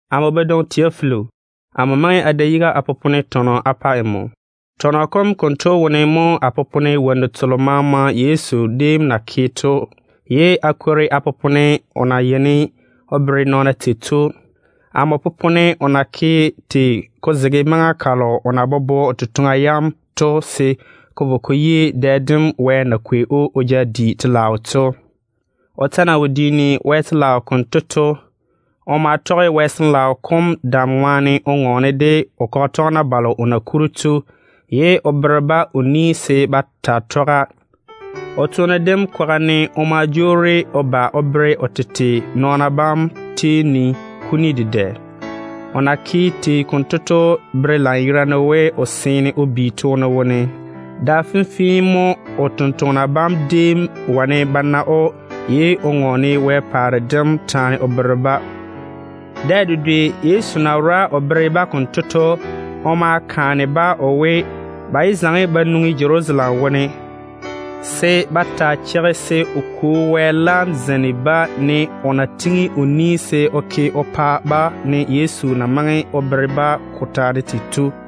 Amo badwoŋi Teofila, amo maŋe a da yiga a popone tɔnɔ a pa nmo. Tɔnɔ kom konto wone mo a popone wonnu telo maama Yezu déem na ke to, ye a kwori a popone o na yeini o bere nɔɔna tei to. Amo popone o na ke tei ko zege maŋa kalo o na bobo o totoŋa yam to se ko vo ko yi dɛ dem Wɛ na kwei‑o o ja di wɛyuu to. O ta na wo diini Wɛ telaao konto to, o ma tɔge Wɛ Sin-laao dam ŋwaane o ŋɔɔne de o totoŋa nakwa balo o na kuri to, ye o bere-ba o ni se ba taa tɔga. O toone dem kwaga ne o daa ma kwei o tete o bere o nɔɔna bam kuni dedɛ. O na ke tei konto to bere lanyerane we o seene o bi toone wone. Da finna mo o tontoŋena bam déem wane ba na‑o, ye o ŋɔɔne Wɛ paare dem taane o bere-ba. Dɛ dedwe Yezu na wora o bere-ba konto to, o ma kaane-ba o we, ba yé zaŋe ba nwoŋi Jerusalem wone. O maa we, “Cheigi-na se a Kwo Wɛ laam zeini abam, ne o na pwooli se o ke o pa abam ye amo maŋe a bere abam ko taane to.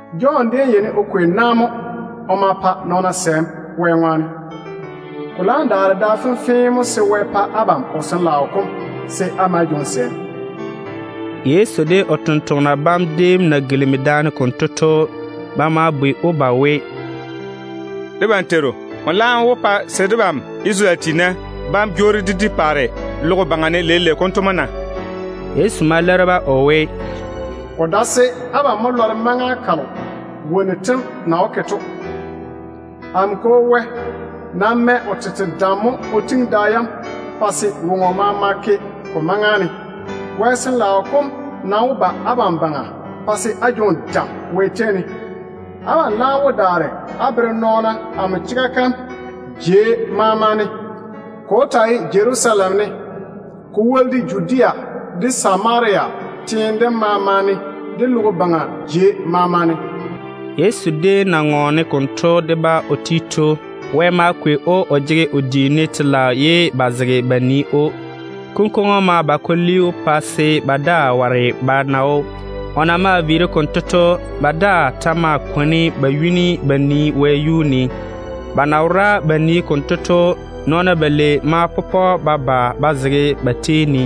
Jɔn déem yeini o kwei na mo o ma pa nɔɔna sɛɛm Wɛ ŋwaane. Ko laam daare da fenfee mo se Wɛ pa abam o Sin-laao kom se á ma á jwoŋi sɛɛm.” Yezu de o tontoŋena bam déem na gilimi daane konto to, ba ma bwei‑o ba we, “Debam Teiru, nmo laam wó pa se debam Isarele tiina bam jwoori dé di paare logo baŋa ne leile konto mo na?” Yezu ma leiri-ba o we, “Ko dae se abam mo lɔre maŋa kalo wonnu tem na wó ke to. Amo Kwo Wɛ nam mɛ o tete dam mo o tiŋi da yam pa se woŋo maama ke ko maŋa ne. Wɛ Sin-laao kom nam wó ba abam baŋa pa se á jwoŋi dam Wɛ tei ne. Abam laam wó daare á zege amo chega kam kwaga ne á bere nɔɔna jei maama ne. Ko wó taa ye Jerusalem ne, ko woli de Judea de Samaria teene dem maama ne, de logo baŋa jei maama ne.” Yezu déem na ŋɔɔne konto de-ba o ti to, Wɛ ma kwei‑o o jege o diini wɛyuu ye ba zege ba nii‑o. Kunkwoŋo ma ba ko li‑o pa se ba daa ware ba na‑o. O na maa viiri konto to, ba daa ta ma kwoni ba yuni ba nii wɛɛne. Ba na wora ba nii konto to, nɔɔna balei ma pɔpɔ ba ba ba zege ba tei ne.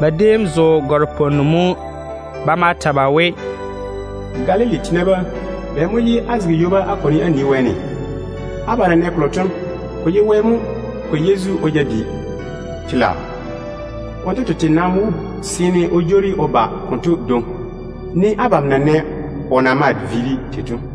Ba déem zo gare-pwonnu mo. Ba ma ta ba we, “Galili tiina bam, bɛ mo ye á zege ywoba á kwoni á nii wɛɛne? Abam na nɛ kolo to, ko ye Wɛ mo kwei Yezu o ja di telaao. Wonto tete nam wó seene o jwoori o ba konto dwoŋi, ne abam na nɛ o na maa viiri tei to.”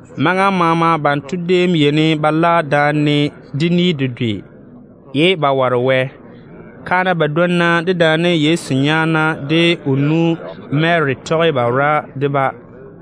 Maŋa maama banto déem yeini ba la daane de ni dedwe, ye ba ware Wɛ. Kaana badwonna dedaane Yezu nyaana de o nu Mary tɔge ba wora de-ba.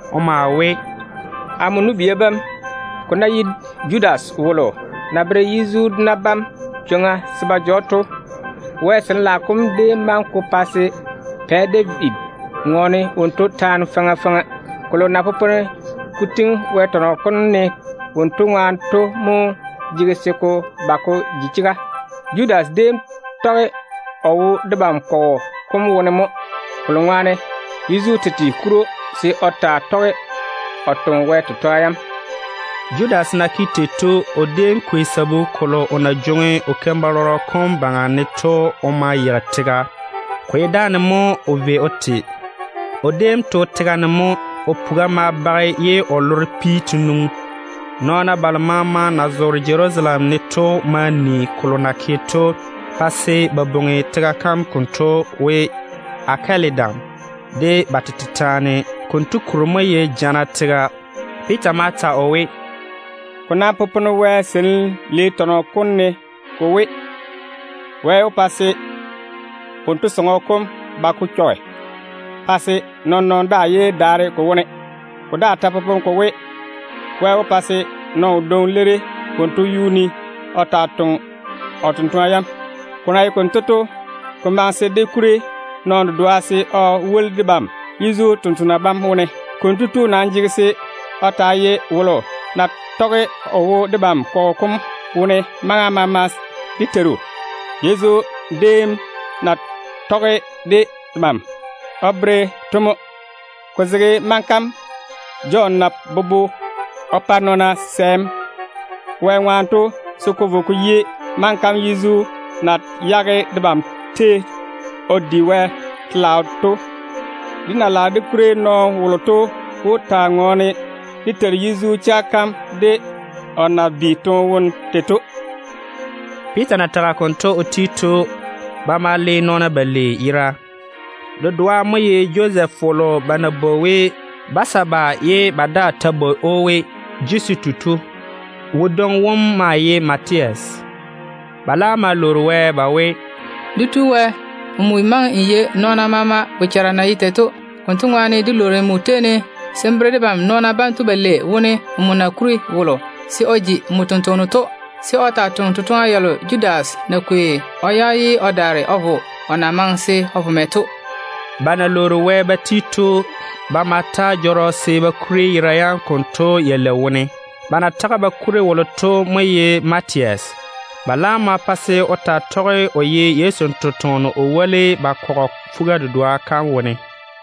O maa we, “Amo nu-bia bam, ko ná ye Judas wolo na bere Yezu dona bam chwoŋa se ba ja‑o to, Wɛ Sin-laao kom déem maŋe ko pa se Pɛ David ŋɔɔne wonto taane faŋa faŋa. Kolo na popone ko tiŋi Wɛ tɔnɔ kom ne wonto ŋwaane to mo jege se ko ba ko ji chega. Judas déem tɔge o wo debam kɔgɔ kom wone mo, kolo ŋwaane Yezu tete kuri‑o se o taa tɔge o toŋe Wɛ totoŋa yam.” Judas na ke tei to, o déem kwei sabu kolo o na jwoŋi o keim-balɔrɔ kom baŋa ne to o ma yeigi tega. Ko ye dáane mo o vei o te. O déem to tega ne mo. O puga ma bage ye o loro pi te nwoŋi. Nɔɔna balo maama na zoore Jerusalem ne to ma ni kolo na ke‑o to, pa se ba bwoŋi tega kam konto we ‘Akɛladam’ de ba tete taane. Konto kuri mo ye ‘Jana tega’. Piita ta ma ta o we, “Ko nam popone Wɛ Seinim Lei tɔnɔ kom ne ko we: ‘Wɛ wó pa se wonto sɔŋɔ kom ji di-dwonnu, pa se nɔɔn-nɔɔno daa yé daare ko wone.’ Ko daa ta popone ko we: ‘Wɛ wó pa se nɔɔno wodwoŋi leiri wonto yuu ne o taa toŋe o totoŋa yam.’ Ko na ye konto to, ko maŋe se dé kuri nɔɔno dedoa se o woli debam Yezu tontoŋena bam wone. Konto tu nam jege se o taa ye wolo na tɔge o wo debam kɔgɔ kom wone maŋa maama dé Teiru Yezu déem na tɔge de debam o beeri to mo, ko zege maŋa kam Jɔn na bobo o pa nɔɔna sɛɛm Wɛ ŋwaane to se ko vo ko yi maŋa kam Yezu na yage debam tei o di Wɛ telaao to. Dé na lage dé kuri nɔɔno wolo to wó zege dé Teiru Yezu chega kam kwaga ne de o na bi toone wone tei to.” Piita na tage konto o ti to, ba ma le nɔɔna balei yera. Dedoa mo ye Josɛf wolo ba na bwoŋi we Basaba ye ba daa ta bwoi‑o we Jusitu to. Wodwoŋi wom maa ye Matias. Ba laam ma lwoori Wɛ ba we, “Dé Teiru Wɛ, nmo maŋe n yei nɔɔna maama bochara na ye tei to. Konto ŋwaane dé lwoori nmo tei ne se n bere debam nɔɔna banto balei wone nmo na kuri wolo se o ji nmo tontoŋeno to, se o taa toŋe totoŋa yalo Judas na kwei o yage ye o daare o vo o na maŋe se o vo mɛ to.” Ba na lwoori Wɛ ba ti to, ba ma ta jɔrɔ se ba kuri yera yam konto yalei wone. Ba na tage ba kuri wolo to mo ye Matias. Ba laam ma pa se o taa tɔge o ye Yezu totoŋa nakwe o woli ba kɔgɔ fuga-dedoa kam wone.